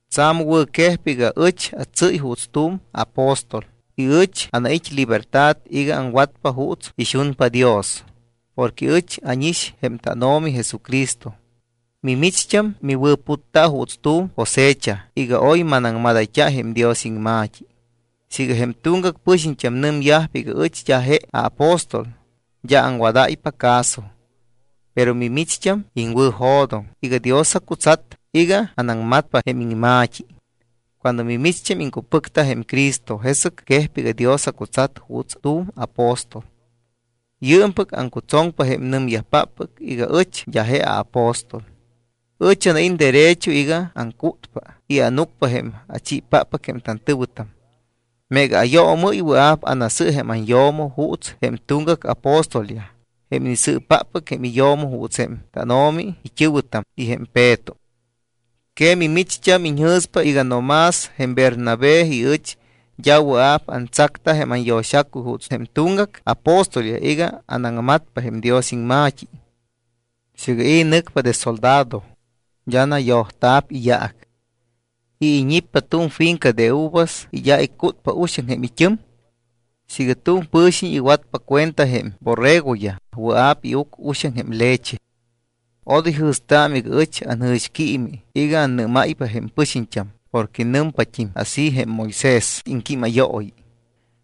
Tsa̱m wɨ̱quejpa iga ɨch atsɨ́y juuts tu̱m apóstol y ɨch anait́ libertad iga aŋwatpa juuts ixunpa Dios porque ɨch ánix jém tánO̱mi Jesucristo. Mimicht́am miwɨ̱putta juuts tu̱m cosecha iga oy manaŋmadayt́a jém Dios iŋma̱t́i. Siiga jém tuŋgac pɨxiñt́am nɨmyajpa iga ɨch d́a je aapóstol, d́a aŋwadáypa caso. Pero micht́am iŋwɨ̱jo̱doŋ iga Dios acutsat iga anaŋmatpa jém iŋma̱t́i. Cuando micht́am iŋcupɨcta jém Cristo, jesɨc quejpa iga Dios acutsat juuts tu̱m apóstol. Yɨɨmpɨc aŋcutsoŋpa jém nɨmyajpáppɨc iga ɨch d́a je aapóstol. Ɨch anait́ derecho iga aŋcútpa y ánucpa jém achiipáppɨc jém tantɨ̱wɨtam. Meega ayoomɨ́y, wɨa̱p anasɨ jém anyo̱mo juuts jém tuŋgac apóstolyaj, jém inisɨɨpáppɨc jém iyo̱mo juuts jém tánO̱mi it́ɨ̱wɨtam y jém Peto. ¿Que mimicht́am iñjɨ̱stámpa iga no más jém Bernabé y ɨch d́a wɨa̱p antsacta jém anyo̱xacuy juuts jém tuŋgac apóstolyaj iga anaŋmatpa jém Dios iŋma̱t́i? Siiga i̱ nɨcpa de soldado, d́a nayojóyayt́a̱p iyaac. ¿I̱ iñippa tu̱m finca de uvas y d́a icútpa uxaŋ jém it́ɨm? Siiga tu̱m pɨ̱xiñ iwatpa cuenta jém borregoyaj, wɨa̱p iuc uxaŋ jém leche. Odoy jɨ̱staamɨ iga ɨch anjɨ̱xquiimi iga annɨ́máypa jém pɨxiñt́am porque nɨmpat́im así jém Moisés iŋquímayooyi.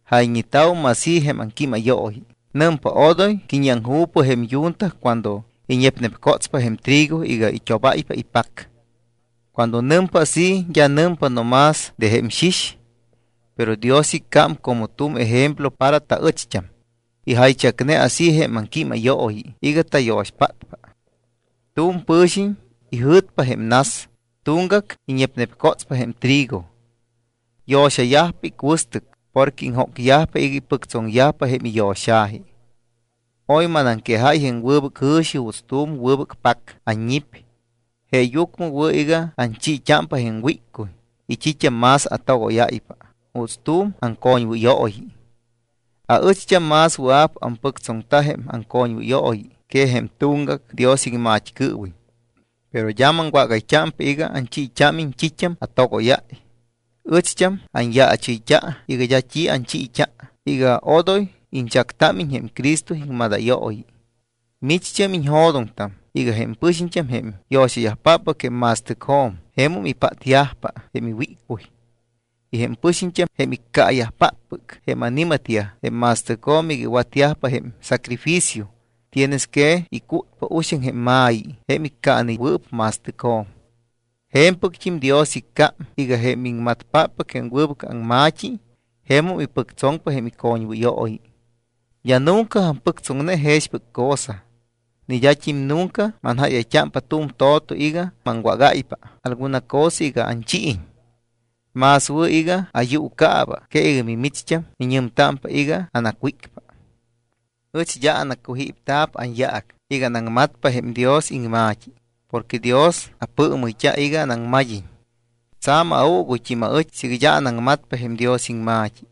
Jayñeta̱wum así jém aŋquímayooyi, nɨmpa: “Odoy qui̱ñiaŋju̱pɨ jém yunta cuando iñepnepcotspa jém trigo iga it́obáypa ipac.” Cuando nɨmpa así, d́a nɨmpa no más de jém xix. Pero Dios icám como tu̱m ejemplo para taɨcht́am. Ijaychacne así jém aŋquímayooyi iga tayo̱xpátpa. Tu̱m pɨ̱xiñ ijɨ̱tpa jém nas, tuŋgac iñepnepcotspa jém trigo. Yo̱xayajpa icuɨstɨc porque iŋjócyajpa iga ipɨctsoŋyajpa jém iyo̱xa̱ji. Oy manaŋquejáy jém wɨbɨc jɨ̱xi juuts tu̱m wɨbɨc pac anñip. Jeeyucmɨ wɨ̱ iga anchiit́ámpa jém wíccuy y t́it́am más atogóyáypa juuts tu̱m aŋcoñwɨyooyi. Aɨcht́am más wɨa̱p ampɨctsoŋta jém aŋcoñwɨyooyi que jém tuŋgac Dios iŋmat́cɨɨwiñ. Pero d́a maŋwágayt́ámpa iga anchiit́ámiñ t́it́am atogóyáy. Ɨcht́am anyaachɨyt́a iga d́a t́i anchiit́a iga odoy iñchactámiñ jém Cristo iŋmadayooyi. Micht́am iñjo̱doŋtam iga jém pɨxiñt́am jém yo̱xayajpáppɨc jém ma̱stɨcjo̱m, jemum ipátyajpa jém iwíccuy. Y jém pɨxiñt́am, jém iccaayajpáppɨc jém ani̱matyaj jém ma̱stɨcjo̱m iga iwatyajpa jém sacrificio, tienes que icútpa uxaŋ jém ma̱yi jém iccaanewɨɨp ma̱stɨcjo̱m. Je̱mpɨct́im Dios iccám iga jém iŋmatpáppɨc jém wɨbɨc aŋma̱t́i jemum ipɨctsoŋpa jém icoñwɨyooyi. D́a nunca ampɨctsoŋne jexpɨc cosa. Ni d́at́im nunca manjáyayt́ámpa tu̱m to̱to iga maŋwágáypa alguna cosa iga anchiiñ. Más wɨ̱ iga ayuucaaba que iga micht́am miñɨmtámpa iga anacwícpa. Ɨch d́a anacujípta̱p anyaac iga anaŋmatpa jém Dios iŋma̱t́i porque Dios apɨɨmɨyt́a iga anaŋmad́iñ. Tsa̱m auuguyt́im aɨch siiga d́a anaŋmatpa jém Dios iŋma̱t́i.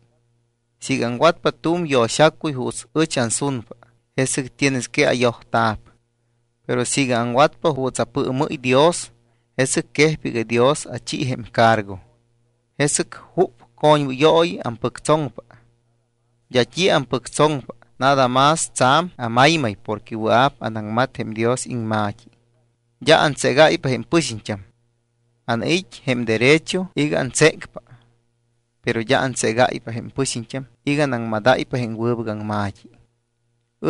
Siiga aŋwatpa tu̱m yo̱xacuy juuts ɨch ansunpa, jesɨc tienes que ayojta̱p. Pero siiga aŋwatpa juuts apɨɨmɨ́y Dios, jesɨc quejpa iga Dios achi jém cargo. ¿Jesɨc jup coñwɨyooyi ampɨctsoŋpa? D́a t́i ampɨctsoŋpa, nada más tsa̱m amaymay porque wɨa̱p anaŋmat jém Dios iŋma̱t́i. D́a antségáypa jém pɨxiñt́am. Anait́ jém derecho iga antsécpa, pero d́a antségáypa jém pɨxiñt́am iga anaŋmadáypa jém wɨbɨc aŋma̱t́i.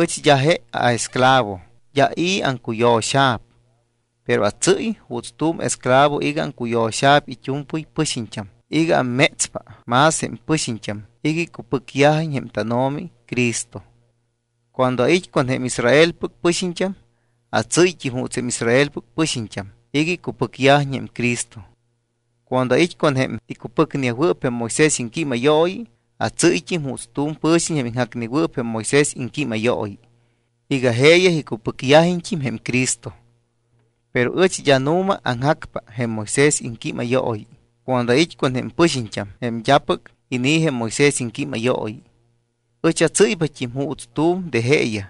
Ɨch d́a je aesclavo. D́a i̱ aŋcuyo̱xa̱p. Pero atsɨ́y juuts tu̱m esclavo iga aŋcuyo̱xa̱p it́u̱mpɨy pɨxiñt́am iga ammétspa más jém pɨxiñt́am iga icupɨcyajiñ jém tánO̱mi Cristo. Cuando ait́ con jém Israelpɨc pɨxiñt́am, atsɨ́yt́im juuts jém Israelpɨc pɨxiñt́am iga icupɨcyajiñ jém Cristo. Cuando ait́ con jém icupɨcneyajwɨɨp jém Moisés iŋquímayooyi atsɨ́yt́im juuts tu̱m pɨ̱xiñ jém iŋjacnewɨɨp jém Moisés iŋquímayooyi iga jeeyaj icupɨcyajiñt́im jém Cristo. Pero ɨch d́a nu̱ma aŋjacpa jém Moisés iŋquímayooyi. Cuando ait́ con jém pɨxiñt́am jém d́apɨc inii̱ jém Moisés iŋquímayooyi, ɨch atsɨ́ypat́im juuts tu̱m de jeeyaj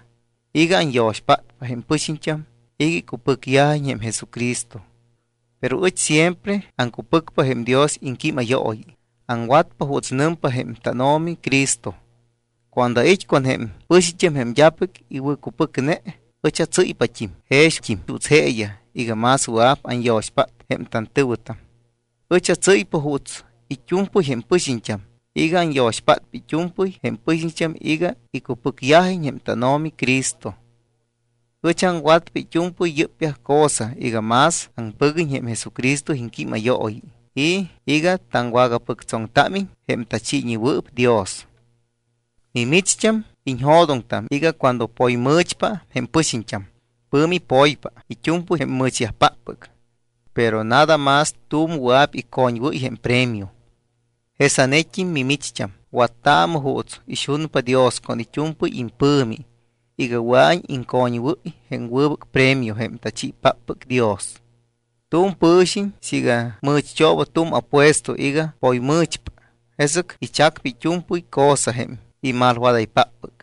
iga anyo̱xpátpa jém pɨxiñt́am iga icupɨcyajiñ jém Jesucristo. Pero ɨch siempre aŋcupɨcpa jém Dios iŋquímayooyi, aŋwatpa juuts nɨmpa jém tánO̱mi Cristo. Cuando ait́ con jém pɨxiñt́am jém d́apɨc iwɨ̱cupɨcne, ɨch atsɨ́ypat́im jext́im juuts jeeyaj iga más wɨa̱p anyo̱xpát jém tantɨ̱wɨtam. Ɨch atsɨ́ypa juuts it́u̱mpɨy jém pɨxiñt́am iga anyo̱xpátpa it́u̱mpɨy jém pɨxiñt́am iga icupɨcyajiñ jém tánO̱mi Cristo. Ɨch aŋwatpa it́u̱mpɨy yɨ́pyaj cosa iga más aŋpɨguiñ jém Jesucristo iŋquímayooyi y iga taŋwagapɨctsoŋtámiñ jém tachiiñewɨɨp Dios. Mimicht́am iñjo̱doŋtam iga cuando poymɨ̱chpa jém pɨxiñt́am, pɨ̱mi poypa it́u̱mpɨy jém mɨ̱chyajpáppɨc. Pero nada más tu̱m wɨa̱p icoñwɨ́y jém premio. Jesanet́im mimicht́am wattaamɨ juuts ixunpa Dios con it́u̱mpɨy impɨ̱mi iga wɨa̱iñ iŋcoñwɨ́y jém wɨbɨc premio jém tachiipáppɨc Dios. Tu̱m pɨ̱xiñ siiga mɨ̱cht́ooba tu̱m apuesto iga poymɨ̱chpa, jesɨc ichacpa it́u̱mpɨy cosa jém imalwadaypáppɨc.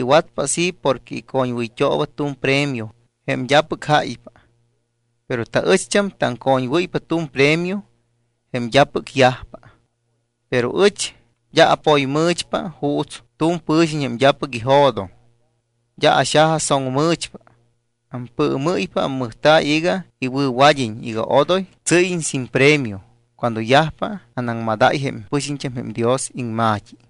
Iwatpa así porque icoñwɨyt́ooba tu̱m premio jém d́apɨc jáypa. Pero taɨcht́am taŋcoñwɨ́ypa tu̱m premio jém d́apɨc yajpa. Pero ɨch d́a apoymɨ̱chpa juuts tu̱m pɨ̱xiñ jém d́apɨc ijo̱doŋ. D́a axajasoŋmɨ̱chpa. Ampɨɨmɨ́y-pa ammɨjta̱y iga iwɨ̱wad́iñ iga odoy atsɨ́yiñ sin premio cuando yajpa anaŋmadáy jém pɨxiñt́am jém Dios iŋma̱t́i.